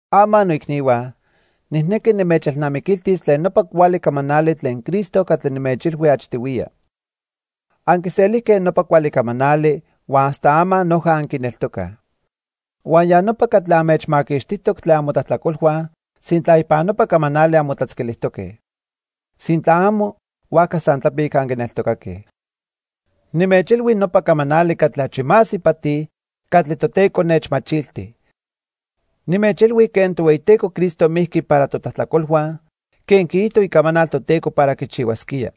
Ama noicnihua, nijnequi nimechelnamiquiltis tlen nopa cuali camanali tlen Cristo catli nimechilhui achtihuiya. Anquiselijque nopa cuali camanali huan hasta ama noja anquineltocaj. Huan ya nopa catli anmechmaquixtijtoc tlen amotlajtlacolhua sintla ipan nopa camanali anmotlatzquilijtoque. Sintla amo, huajca san tlapic anquineltocaque. Nimechilhui nopa camanali catli achi más ipati catli Toteco nechmachilti. Nimechilhui quen Tohueyiteco Cristo mijqui para totlajtlacolhua quen quiijto Icamanal Toteco para quichihuasquía.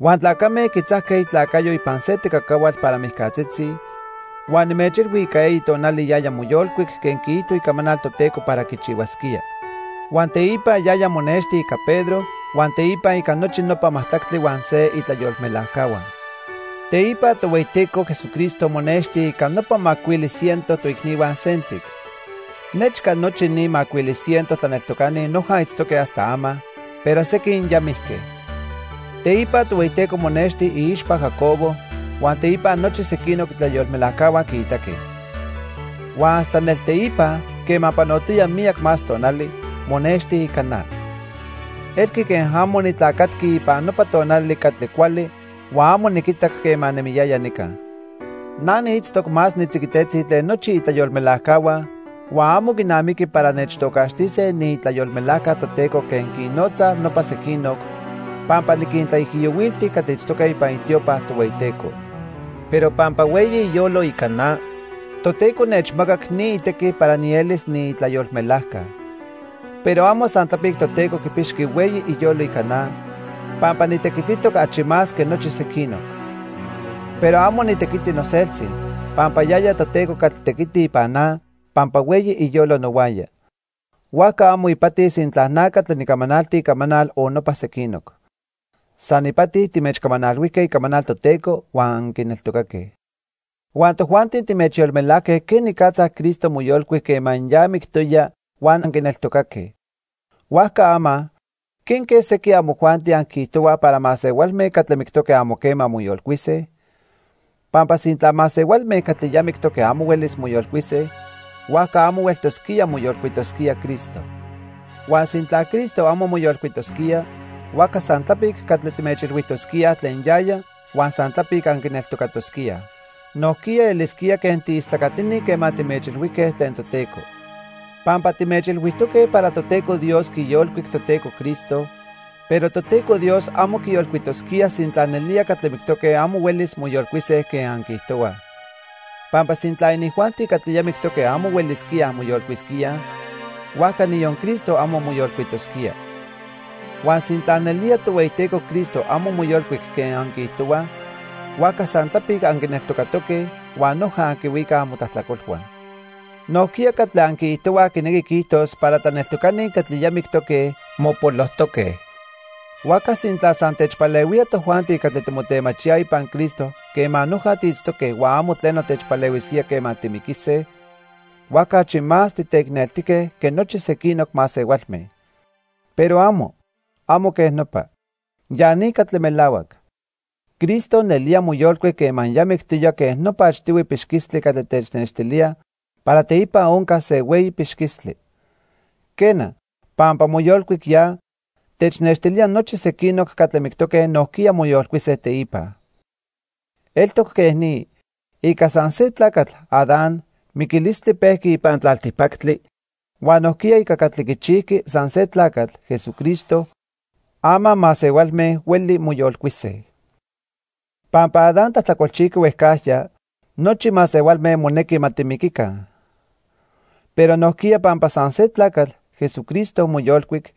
Huan tlacame quitzajque itlacayo ipan se tecacahuatl para mijcatzitzi, huan nimechilhui ica eyi tonali yaya moyolcuic quen quiijto Icamanal Toteco para quichihuasquía. Huan teipa yaya monexti ica Pedro huan teipa ica nochi nopa majtlactli huan se itlayolmelajcahua. Teipa Tohueyiteco Jesucristo monexti ica pano macuili ciento toicnihua sentic. Nechca nochi ni macuili ciento tlaneltocani noja itztoque hasta ama, pero sequin ya mijque. Teipa Tohueyiteco monexti iixpa Jacobo, huan teipa nochi sequinoc itlayolmelajcahua quiitaque. Huan hasta nelteipa, quema panotoya miyac más tonali, monexti ica na. Elqui quen amo nitlacatqui ipan nopa tonali catli cuali huan amo niquitac quema nemiyaya nica. Na niitztoc más nitziquitetzi tlen nochi itlayolmelajcahua huan amo quinamiqui para nechtocaxtise niitlayolmelajca Toteco quen quinnotzaj nopa sequinoc, pampa niquintlaijiyohuilti catli itztoque ipan itiopa Tohueyiteco. Pero pampa hueyi iyolo ica na, Toteco nechmacac ni itequi para nielis niitlayolmelajca. Pero amo san tlapic Toteco quipixqui hueyi iyolo ica na, pampa nitequititoc achi más que nochi sequinoc. Pero amo nitequiti noseltzi, pampa yaya Toteco catli tequiti ipan na pampa hueyi iyolo nohuaya. Huajca amo ipati sintla na catli nicamanalti icamanal o nopa sequinoc. San ipati timechcamanalhuijque icamanal Toteco huan anquineltocaque. Huan tojuanti timechyolmelajque quenicatza Cristo moyolcuic quema ya mictoya huan anquineltocaque. Huajca ama ¿quenque sequin amojuanti anquiijtohuaj para masehualme catli mictoque amo quema moyolcuise? Pampa sintla masehualme catli ya mictoque amo huelis moyolcuise, huajca amo hueltosquía moyolcuitosquía Cristo. Huan sintla Cristo amo moyolcuitosquía, huajca san tlapic catli timechilhuijtosquíaj tlen yaya huan san tlapic anquineltocatosquíaj. Nojquiya elisquía quen tiistlacatini quema timechilhuijque tlen Toteco. Pampa timechilhuijtoque para Toteco Dios quiyolcuic Toteco Cristo, pero Toteco Dios amo quiyolcuitosquía sintla nelía catli mictoque amo huelis moyolcuise quen anquiijtohuaj. Pampa sintla inijuanti catli ya mictoque amo huelisquíaj moyolcuisquíaj, huajca niyon Cristo amo moyolcuitosquía. Huan sintla nelía Tohueyiteco Cristo amo moyolcuic quen anquiijtohuaj, huajca san tlapic anquineltocatoque huan noja anquihuicaj amotlajtlacolhua. Nojquiya catli anquiijtohuaj quinequi quiijtos para tlaneltocani catli ya mictoque, mopolojtoque. Huajca sintla san techpalehuía tojuanti catli timotemachíaj ipan Cristo quema noja tiitztoque huan amo tleno techpalehuisquía quema timiquise, huajca achi más titeicneltique que nochi sequinoc masehualme. Pero amo, amo quej nopa. Ya ni catli melahuac. Cristo nelía moyolcuic quema ya mictoya quen nopa achtihui pixquistli catli tenextilía para teipa oncas se hueyi pixquistli. Quena, pampa moyolcuic ya, technextilía nochi sequinoc catli mictoque nojquiya moyolcuise teipa. Eltoc quej ni. Ica san se tlacatl, Adán, miquilistli pejqui ipan tlaltipactli, huan nojquiya ica catli quichijqui san se tlacatl, Jesucristo, ama masehualme hueli moyolcuise. Pampa Adán tlajtlacolchijqui huejcajya, nochi masehualme monequi ma timiquica. Pero nojquiya pampa san se tlacatl, Jesucristo moyolcuic,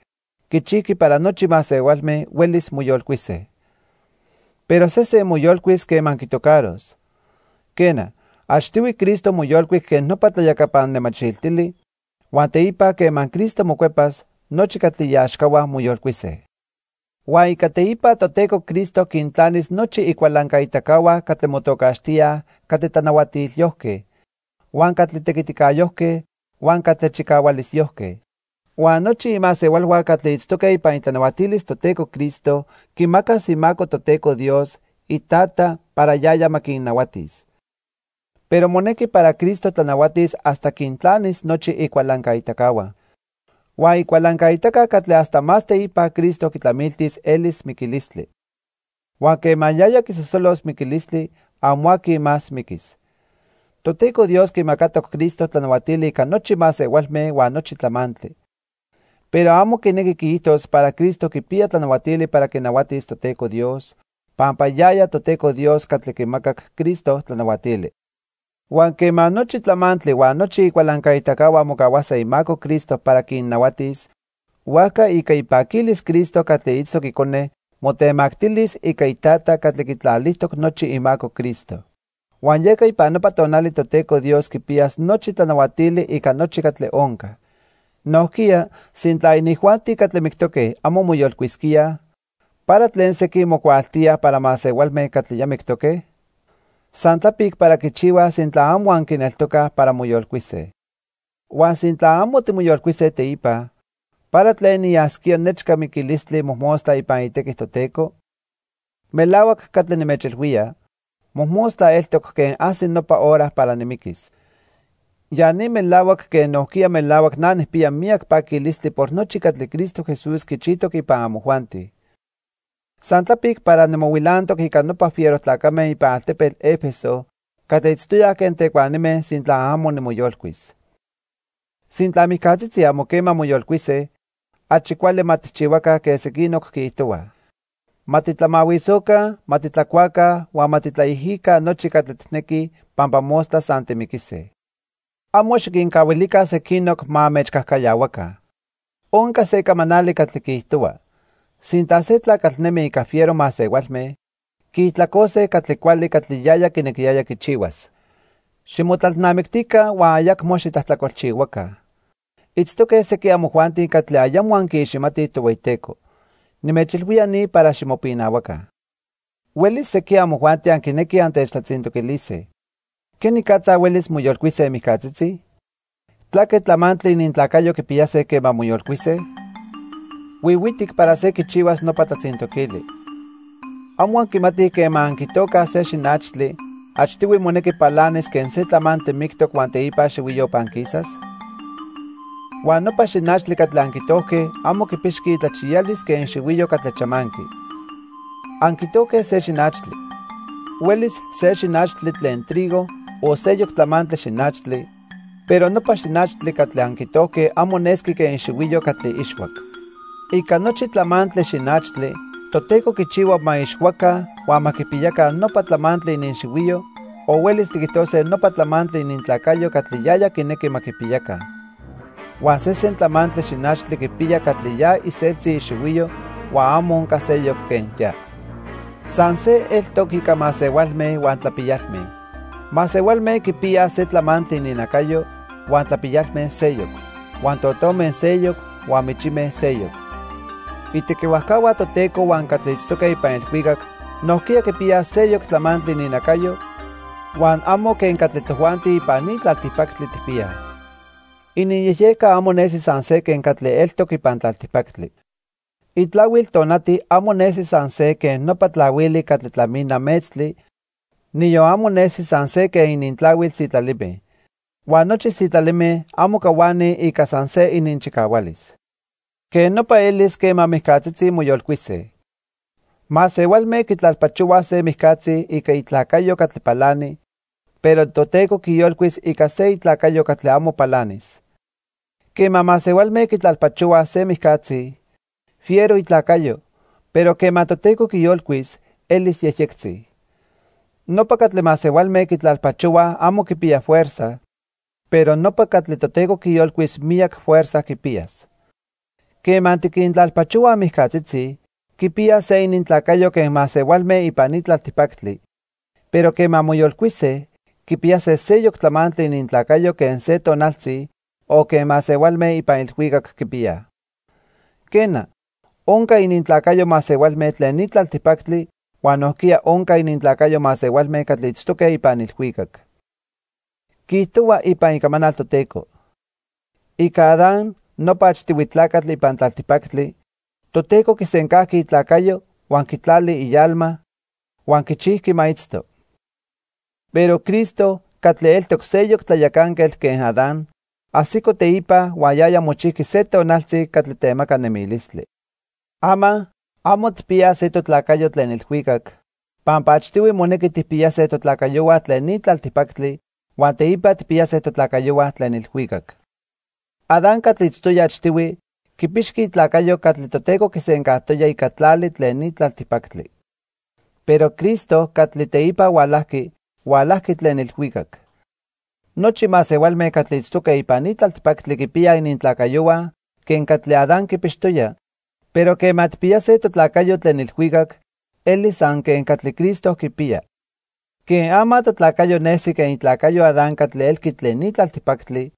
quichijqui para nochi masehualme huelis moyolcuise. Pero sesen moyolcuis quema quitocaros. Quena, achtihui Cristo moyolcuic quen nopa tlayacapan nemachiltili, huan teipa quema Cristo mocuepas, nochi catli iaxcahua moyolcuise. Huan ica teipa Toteco Cristo quintlanis nochi icualancaitacahua catli motocaxtíaj catli tlanahuatilyojque, huan catli tequiticayojque huan catli chicahualisyojque. Huan nochi imasehualhua catli itztoque ipan itlanahuatilis Toteco Cristo quimacas imaco Toteco Dios, iTata, para yaya ma quinnahuatis. Pero monequi para Cristo tlanahuatis hasta quintlanis nochi icualancaitacahua. Huan icualancaitaca catli hasta más teipa Cristo quitlamiltis elis miquilistli. Huan quema yaya quisosolos miquilistli, amo aqui más miquis. Toteco Dios quimacatoc Cristo tlanahuatili ica nochi masehualme huan nochi tlamantli. Pero amo quinequi quiijtos para Cristo quipiya tlanahuatili para quinahuatis Toteco Dios, pampa yaya Toteco Dios catli quimacac Cristo tlanahuatili. Huan quema nochi tlamantli huan nochi icualancaitacahua mocahuase imaco Cristo para quinnahuatis, huajca ica ipaquilis Cristo catli itztoc Icone motemactilis ica iTata catli quitlalijtoc nochi imaco Cristo. Huan yeca ipan nopa tonali Toteco Dios quipiyas nochi tlanahuatili ica nochi catli onca. Nojquiya, sintla inijuanti catli mictoque amo moyolcuisquíaj, ¿para tlen sequin mocuaaltíaj para masehualme catli ya mictoque? San tlapic para quichihuaj sintla amo anquineltocaj para moyolcuise. Huan sintla amo timoyolcuise teipa, ¿para tlen niyasquía nechca miquilistli mojmostla ipan itequi Toteco? Melahuac catli nimechilhuía, mojmostla eltoc quen ajsi nopa hora para nimiquis. Ya ni melahuac quen nojquiya melahuac na nijpiya miyac paquilistli por nochi catli Cristo Jesús quichijtoc ipan amojuanti. San tlapic para nimohuilantoc ica nopa fiero tlacame ipan altepetl 'Efeso catli itztoyaj quen tecuanime sintla amo nimoyolcuis. Sintla mijcatzitzi amo quema moyolcuise, achi cuali ma tijchihuaca quen sequinoc quiijtohuaj: "Ma titlamahuisoca, ma titlacuaca huan ma titlaijica nochi catli tijnequij pampa mostla san timiquise." Amo xiquincahuilica sequinoc ma anmechcajcayahuaca. Onca se camanali catli quiijtohua: "Sintla se tlacatl nemi ica fiero masehualme, quiijtlacose catli cuali catli yaya quinequiyaya quichihuas." Ximotlalnamictica huan ayacmo xitlajtlacolchihuaca. Itztoque sequin amojuanti catli ayamo anquiiximatij Tohueyiteco. Nimechilhuía ni para ximopinahuaca. Huelis sequin amojuanti anquinequij antechtlatzintoquilise: "¿Quenicatza huelis moyolcuise mijcatzitzi? ¿Tlaque tlamantli inintlacayo quipiyase quema moyolcuise?" Huihuitic para se quichihuas nopa tlatzintoquili. ¿Amo anquimatij quema anquitocaj se xinachtli, achtihui monequi palanis quen se tlamantli mictoc huan teipa xihuiyo panquisas? Huan nopa xinachtli catli anquitojque amo quipixqui itlachiyalis quen ixihuiyo catli chamanqui. Anquitojque se xinachtli. Huelis se xinachtli tlen trigo o seyoc tlamantli xinachtli, pero nopa xinachtli catli anquitojque amo nesqui quen ixihuiyo catli ixhuac. Ica nochi tlamantli xinachtli Toteco quichihua ma ixhuaca huan ma quipiyaca nopa tlamantli ininxihuiyo o huelis tiquijtose nopa tlamantli inintlacayo catli yaya quinequi ma quipiyaca. Huan sesen tlamantli xinachtli quipiya catli ya iseltzi ixihuiyo huan amo onca seyoc quen ya. San se eltoc ica masehualme huan tlapiyalme. Masehualme quipiyaj se tlamantli ininnacayo, huan tlapiyalme seyoc, huan totome seyoc huan michime seyoc. Itequihuajcahua Toteco huan catli itztoque ipan ilhuicac nojquiya quipiyaj seyoc tlamantli ininnacayo huan amo quen catli tojuanti ipan ni tlaltipactli tijpiyaj. Ininyejyejca amo nesi san se quen catli eltoc ipan tlaltipactli. Itlahuil tonati amo nesi san se quen nopa tlahuili catli tlamina metztli, niyon amo nesi san se quen inintlahuil sitlalime. Huan nochi sitlalime amo cahuanij ica san se ininchicahualis. Quej nopa elis quema mijcatzitzi moyolcuise. Masehualme quitlalpachohuaj se mijcatzi ica itlacayo catli palani, pero Toteco quiyolcuis ica se itlacayo catli amo palanis. Quema masehualme quitlalpachohuaj se mijcatzi, fiero itlacayo, pero quema Toteco quiyolcuis, elis yejyectzi. Nopa catli masehualme quitlalpachohuaj amo quipiya fuerza, pero nopa catli Toteco quiyolcuis miyac fuerza quipiyas. Quema tiquintlalpachohuaj mijcatzitzi, quipiyaj se inintlacayo quen masehualme ipan ni tlaltipactli, pero quema moyolcuise, quipiyase seyoc tlamantli inintlacayo quen se tonaltzi, o quen masehualme ipan ilhuicac quipiyaj. Quena, onca inintlacayo masehualme tlen ni tlaltipactli huan nojquiya onca inintlacayo masehualme catli itztoque ipan ilhuicac. Quiijtohua ipan Icamanal Toteco: "Ica Adán, nopa achtihui tlacatl ipan tlaltipactli, Toteco quisencajqui itlacayo huan quitlali ialma huan quichijqui ma itzto." Pero Cristo, catli eltoc seyoc tlayacanquetl quen Adán, ajsico teipa huan yaya mochijqui se tonaltzi catli temaca nemilistli. Ama, amo tijpiyaj se totlacayo tlen ilhuicac, pampa achtihui monequi tijpiyase totlacayohua tlen ni tlaltipactli huan teipa tijpiyase totlacayohua tlen ilhuicac. Adán catli itztoya achtihui, quipixqui itlacayo catli Toteco quisencajtoya ica tlali tlen ni tlaltipactli. Pero Cristo catli teipa hualajqui, hualajqui tlen ilhuicac. Nochi masehualme catli itztoque ipan ni tlaltipactli quipiyaj inintlacayohua quen catli Adán quipixtoya, pero quema tijpiyase totlacayo tlen ilhuicac, elis san quen catli Cristo quipiya. Quen ama totlacayo nesi quen itlacayo Adán catli elqui tlen ni tlaltipactli,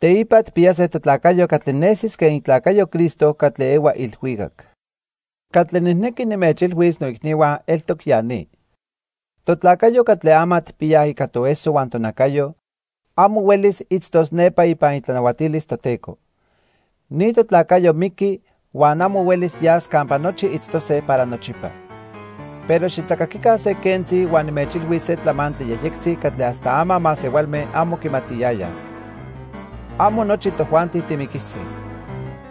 teipa tijpiyase totlacayo catli nesis quen itlacayo Cristo catli ehua ilhuicac. Catli nijnequi nimechilhuis noicnihua eltoc ya ni. Totlacayo catli ama tijpiyaj ica toeso huan tonacayo, amo huelis itztos nepa ipan itlanahuatilis Toteco. Ni totlacayo miqui huan amo huelis yas campa nochi itztose para nochipa. Pero xitlacaquica se quentzi huan nimechilhuis se tlamantli yejyectzi catli hasta ama masehualme amo quimatiyayaj. Amo nochi tojuanti timiquise,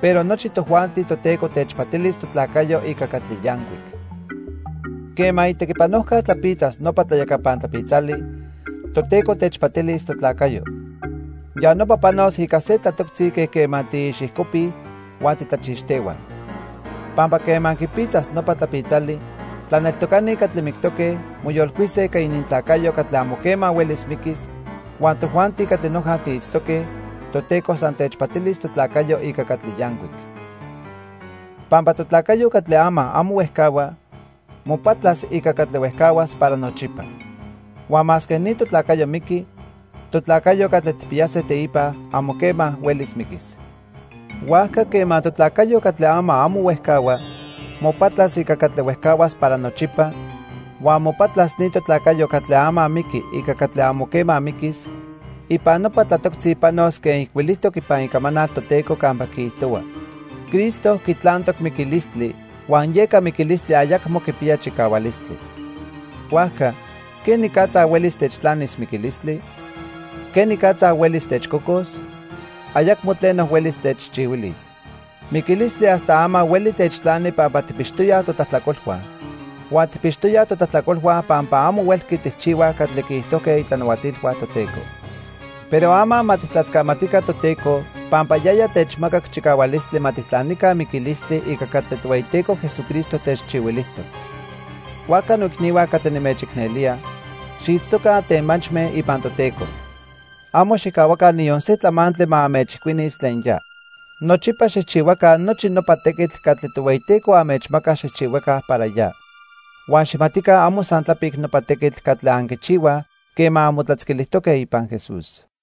pero nochi tojuanti Toteco techpatilis totlacayo ica catli yancuic. Quema itequipanojca tlapitzas nopa tlayacapan tlapitzali, Toteco techpatilis totlacayo. Ya nopa panos ica se tlatoctzi quen quema tiixijcopij huan titlachixtehuaj. Pampa quema quipitzas nopa tlapitzali, tlaneltocani catli mictoque, moyolcuise ica inintlacayo catli amo quema huelis miquis, huan tojuanti catli noja tiitztoque, Toteco san techpatilis totlacayo ica catli yancuic. Pampa totlacayo catli ama amo huejcahua, mopatlas ica catli huejcahuas para nochipa. Huan masque ni totlacayo miqui, totlacayo catli tijpiyase teipa, amo quema huelis miquis. Huajca, quema totlacayo catli ama amo huejcahua mopatlas ica catli huejcahuas para nochipa, huan mopatlas ni totlacayo catli ama miqui ica catli amo quema miquis, ipan nopa tlatoctzi panos quen ijcuilijtoc ipan Icamanal Toteco campa quiijtohua: "Cristo quitlantoc miquilistli huan yeca miquilistli ayacmo quipiya chicahualistli. Huajca ¿quenicatza huelis techtlanis miquilistli? ¿Quenicatza huelis techcocos? Ayacmo tleno huelis techchihuilis." Miquilistli hasta ama hueli techtlani pampa tijpixtoyaj totlajtlacolhua. Huan tijpixtoyaj totlajtlacolhua pampa amo huelqui tijchihuaj catli quiijtojque itlanahuatilhua Toteco. Pero ama ma tijtlascamatica Toteco pampa yaya techmacac chicahualistli ma tijtlanica miquilistli ica catli Tohueyiteco Jesucristo techchihuilijtoc. Huajca noicnihua catli nimechicnelía, xiitztoca antemachme ipan Toteco. Amo xijcahuaca niyon se tlamantli ma anmechijcuinis tlen ya. Nochipa xijchihuaca nochi nopa tequitl catli Tohueyiteco anmechmaca xijchihuaca para ya. Huan xijmatica amo san tlapic nopa tequitl catli anquichihuaj quema anmotlatzquilijtoque ipan Jesús.